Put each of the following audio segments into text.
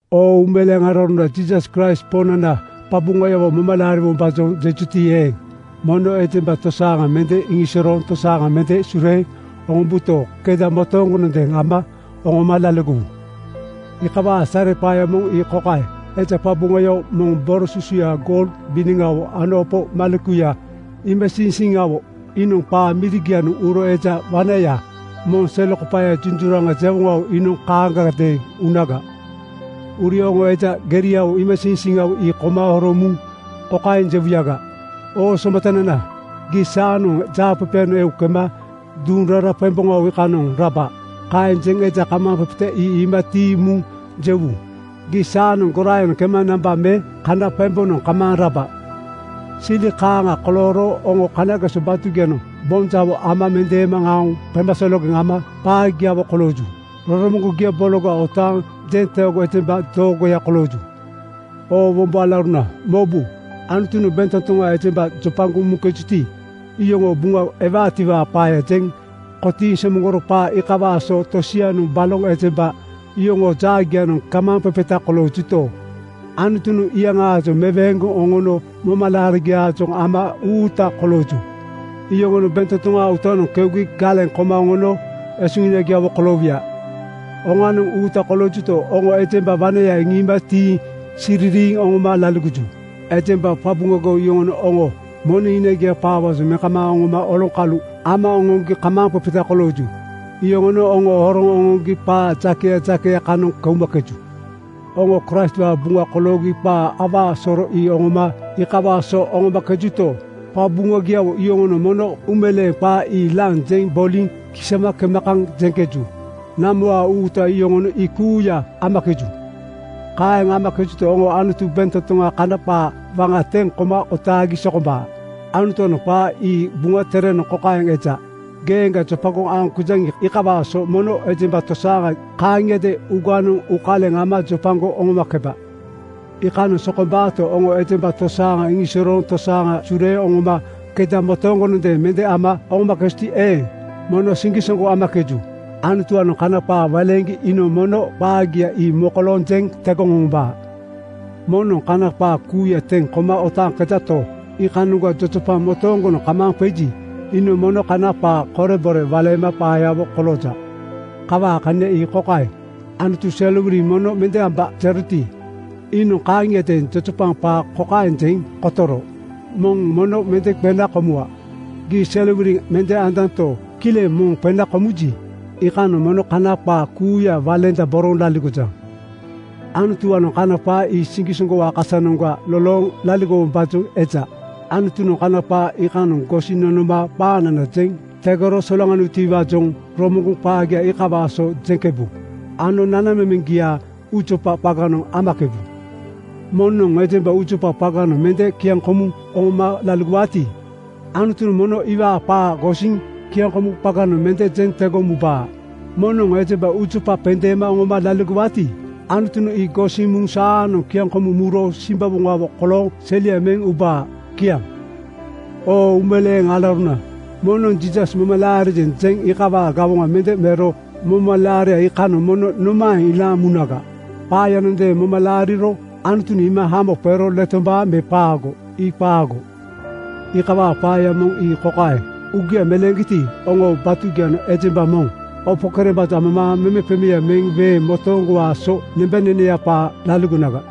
Oo uumeleeŋ alauruna! Jiisas Kraist Poŋnana qaqabuŋayawo moma laariwombaajoŋ jejuti eeŋ, mono ejemba tosaaŋa mende iŋisorooŋ tosaaŋa mende sureeŋ oŋombuto, keda motooŋgonoŋ ama oŋoma laligowu. Iikawaa sareqaaya moŋ ii kokaeŋ: Eja qabuŋayawo moŋ, boro susuya goul biniŋawo ano opo malekuya iimasiiŋsiiŋawo, iinoŋ qaa mirigianoŋ uro eja wanaya moŋ selekopaaya junjuraŋa jewoŋawo iinoŋ kaaŋagadeeŋ unaga. Uri oŋo eja geria iimasiiŋsiiŋawo ii koma horoŋ muŋ kokaeŋ jewuyaga, “Oo somatanana, gii saanoŋ jaaqeqeyanoŋ eu kema duŋ rara qemboŋawo iikanoŋ raba.” Kaeŋ jeŋ eja kamaaŋqeqeta ii iima tiiŋ muŋ jewu, “Gii saanoŋ goraayanoŋ kema namba me kana qembonoŋ kamaaŋ raba.” Sili kaaŋa kolooro oŋo kanageso batugianoŋ boŋ jawo ama mendeema aoŋ qemasologeŋ ama qaagiawo kolooju. Roromoŋgogia bologa otaaŋ jenteego ejemba doogoya kolooju. Oo wombo alauruna, mobu! Anutunoŋ bentotoŋa ejemba jopagoŋ muŋkejuti, iyoŋoo buŋa ewaatiwaa qaaya jeŋ kotiiŋ somoŋgoro. Qaa iikawaa so tosianoŋ baloŋ ejemba yoŋoo jaagianoŋ kamaaŋqeqeta koloojuto, Anutunoŋ ii iyaŋaajoŋ meweeŋgoŋ oŋono momalaarigiaajoŋ ama uuta kolooju. Yoŋonoŋ bentotoŋaa uutanoŋ keugi galeŋ koma oŋono esuhinagiawo koloowuya. Hoŋanoŋ uuta koloojuto, oŋo ejemba wanaya iŋiima tiiŋ sisiriiŋ oŋoma laligoju. Ejemba qabuŋagiawo yoŋonoŋ oŋo moneŋ hinagia qaawaajoŋ meŋ kamaaŋ oŋoma oloŋkalu ama oŋoŋgi kamaaŋqeqeta kolooŋkeju. Yoŋonoŋ oŋo horoŋ oŋoŋgi qaa jakeya jakeya kanoŋ keumakeju. Oŋo Kraistwaa buŋa koloogi qa awaa soro ii oŋoma iikawaa so oŋoomakejuto, qabuŋagiawo yoŋonoŋ mono uumeleeŋ (kristen) qa ii laŋ jeŋ boliŋ kisama kema kaŋ jeŋkeju? Namowaa uuta yoŋonoŋ ii kuuya amakeju. Kaeŋ amakejuto, oŋonoŋ Anutu bentotoŋaa kana qaa waŋa teŋ koma otaagi sokombaa. Anutuwaanoŋ qaa ii Buŋa Terenoŋ kokaeŋ eja: “Geeŋga jopagoŋ aoŋkejaŋi, iikawaa so mono ejemba tosaaŋa kaaŋiadeeŋ uuganoŋ uukaleŋ ama jopagoŋ oŋomakeba.” Iikanoŋ sokombaato, oŋo ejemba tosaaŋa iŋisorooŋ tosaaŋa sureeŋ oŋoma keda motooŋgonoŋ mende ama oŋomakejuti eeŋ, mono siŋgisoŋgo amakeju. Anutuwaanoŋ kana qaa waleeŋgi iinoŋ mono qaagia ii mokolooŋ jeŋ tegoŋ oŋombaa. Moŋnoŋ kana qaa kuuya teŋ koma otaaŋkejato, iikanoŋga jojopaŋ motooŋgonoŋ kamaaŋ qeji, iinoŋ mono kana qaa korebore waleema qaayawo kolooja. Kawaa kania ii kokaeŋ: Anutu “Serowiliŋ mono mende amba,” jeroti, iinoŋ kaaŋiadeeŋ jojopaŋ qaa kokaeŋ jeŋ kotoro, “Moŋ mono mende qena komuwa.” Gii serowiliŋ mende anjanto, kileŋ moŋ qena komuji, iikanoŋ mono kana qaa kuuya waleendaboroŋ laligojaŋ. Anutuwaanoŋ kana qaa ii siŋgisoŋgowaa kasanoŋga lolooŋ laligowombaajoŋ eja. Anutunoŋ kana qaa iikanoŋ gosiŋ nonoma qaanana jeŋ tegoro solaŋaniwutiwaajoŋ romoŋgoŋ qaagia iikawaa so jeŋkebu ano nanamemeŋgia uujopa qaganoŋ amakebu. Moŋnoŋ ejemba uujopa qaganoŋ mende kiaŋkomuŋ oŋoma laligowaati, Anutunoŋ mono iwaa qaa gosiŋ kiaŋkomu qaganoŋ mende jeŋ tegoŋ mubaa. Moŋnoŋ ejemba uujopa qendeema oŋoma laligowaati, Anutunoŋ ii gosiŋ muŋ saanoŋ kiaŋkomuŋ muro simbawoŋawo kolooŋ selia meŋ ubaa. Kiaŋ. Oo uumeleeŋ alauruna, moŋnoŋ “Jiisas moma laarijeŋ,” jeŋ iikawaa gawoŋa mende mero momalaaria iikanoŋ mono nomaeŋ ilaaŋ munaga? Qaayanondeeŋ moma laariro Anutunoŋ iima hamo qero letombaa me qaago? Ii qaago! Iikawaa qaaya moŋ ii kokaeŋ: Uugia meleeŋgiti, oŋoo batugianoŋ ejemba moŋnoŋ opo kerembaajoŋ amamaaŋ memeqemeaŋ meŋ weeŋ motooŋgowaa so nembaneneya qaa laligonaga.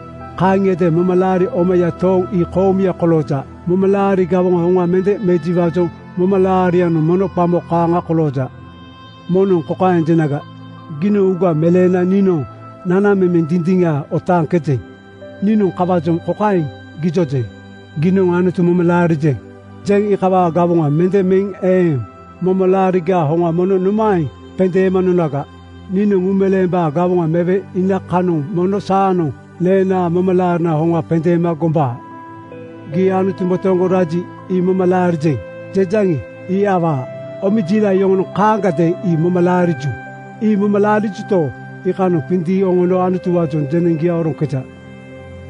Kaaŋiadeeŋ momalaari omaya tooŋ ii koomuya kolooja. Momalaari gawoŋaa hoŋa mende mejiwaajoŋ momalaarianoŋ mono qamo kaaŋa kolooja. Moŋnoŋ kokaeŋ jenaga, “Giinoŋ uuga meleena niinoŋ nanamemeŋ dindiŋa otaaŋkejeŋ.” Niinoŋ kawaajoŋ kokaeŋ gijojeŋ, “Giinoŋ ‘Anutu moma laarijeŋ,’ jeŋ iikawaa gawoŋa mende meŋ eeŋ momalaarigaa hoŋa mono nomaeŋ qendeema nonaga? Niinoŋ uumeleembaa gawoŋa mewe iina kanoŋ mono saanoŋ neenaa momalaarinaa hoŋa qendeema gombaa.” Gii “Anutu motooŋgo raji, ii moma laarijeŋ,” jejaŋi, ii awaa! Omejiilaŋ yoŋonoŋ kaaŋagadeeŋ ii moma laariju. Ii moma laarijuto, iikanoŋ qindiiŋ oŋono Anutuwaajoŋ jeneŋgia oroŋkeja.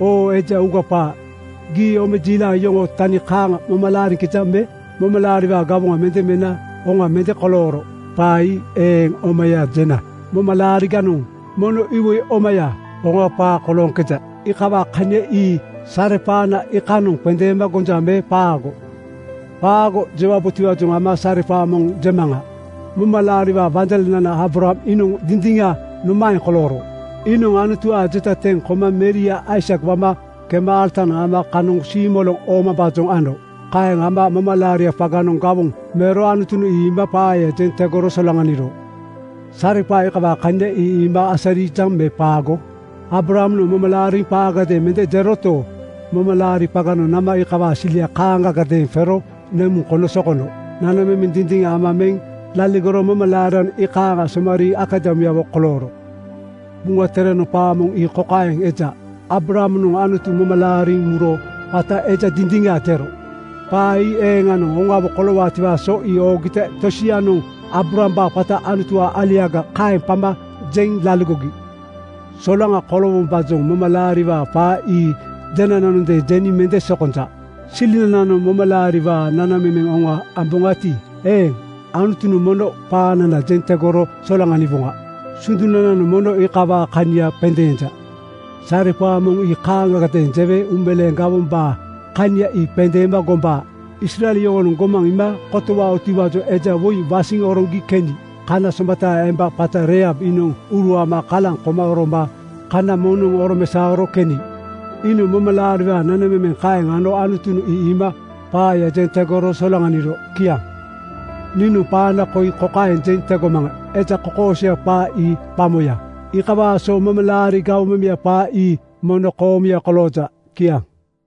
Oo eja uuga qaa, gii omejiilaŋ yoŋoo tani kaaŋa moma laariŋkejaŋ me? Momalaariwaa gawoŋa mende mena hoŋa mende kolooro qaa ii eeŋ omaya jena momalaariganoŋ mono iwoi omaya, hoŋa qaa kolooŋkeja. Iikawaa kania ii sareqaana iikanoŋ qendeema gonja me qaago? “Qaago!” jewabotiwaajoŋ ama sareqaa moŋ jemaŋa. Momalaariwaa wanjalenana Aabraham iinoŋ dindiŋa nomaeŋ kolooro? Iinoŋ Anutuwaa jeta teŋ koma meria Aisak wama kema alatanoŋ ama kanoŋ siimoloŋ oomambaajoŋ ano. Kaeŋ ama momalaari qaganoŋ gawoŋ mero Anutunoŋ ii iima qaaya jeŋ tegoro solaŋaniro. Sareqaa iikawaa kania ii iima asarijaŋ me qaago? Aabrahamnoŋ moma laariŋ qaagadeeŋ mende jeroto, momalaari qaganoŋ nama iikawaa silia kaaŋagadeeŋ qero nemuŋ kono sokono. Nanamemeŋ dindiŋa ama meŋ laligoro momalaarianoŋ iikaaŋ somariiŋ akadamuyawo kolooro. Buŋa Terenoŋ qaa moŋ ii kokaeŋ eja, “Aabrahamnoŋ Anutu moma laariŋ muro qata Eja Dindiŋa jero.” Qaa ii eeŋanoŋ hoŋawo koloorotiwaa so ii oogita tosianoŋ Aabrahambaa qata “Anutuwaa aliaga,” kaeŋ qama jeŋ laligogi. Solaŋa koloowombaajoŋ momalaariwaa qaa ii jenananondeeŋ jeniŋ mende sokonja. Silinananoŋ momalaariwaa nanamemeŋ hoŋa amboŋati eeŋ, Anutunoŋ mono qaanana jeŋ tegoro solaŋaniwoŋa. Sundunanoŋ mono iikawaa kania qendeenja. Sareqaa moŋ ii kaaŋagadeeŋ jewe uumeleeŋ gawombaa kania ii qendeema gombaa: Israel yoŋonoŋ gomaŋ iima kotowaotiwaajoŋ eja woi wasiŋ oroŋgi keni kana somataa emba qata Reihab iinoŋ uruama kalaŋ koma oroma kana moŋnoŋ oromesaoro keni. Iinoŋ momalaariwaa nanamemeŋ kaeŋ ano Anutunoŋ ii iima qaaya jeŋ tegoro solaŋaniro. Kiaŋ. Niinoŋ qaana koi kokaeŋ jeŋ tegomaŋa: Eja kokoosoya qaa ii qamoya. Iikawaa so momalaari gawoŋmemeya qaa ii mono koomuya kolooja. Kiaŋ.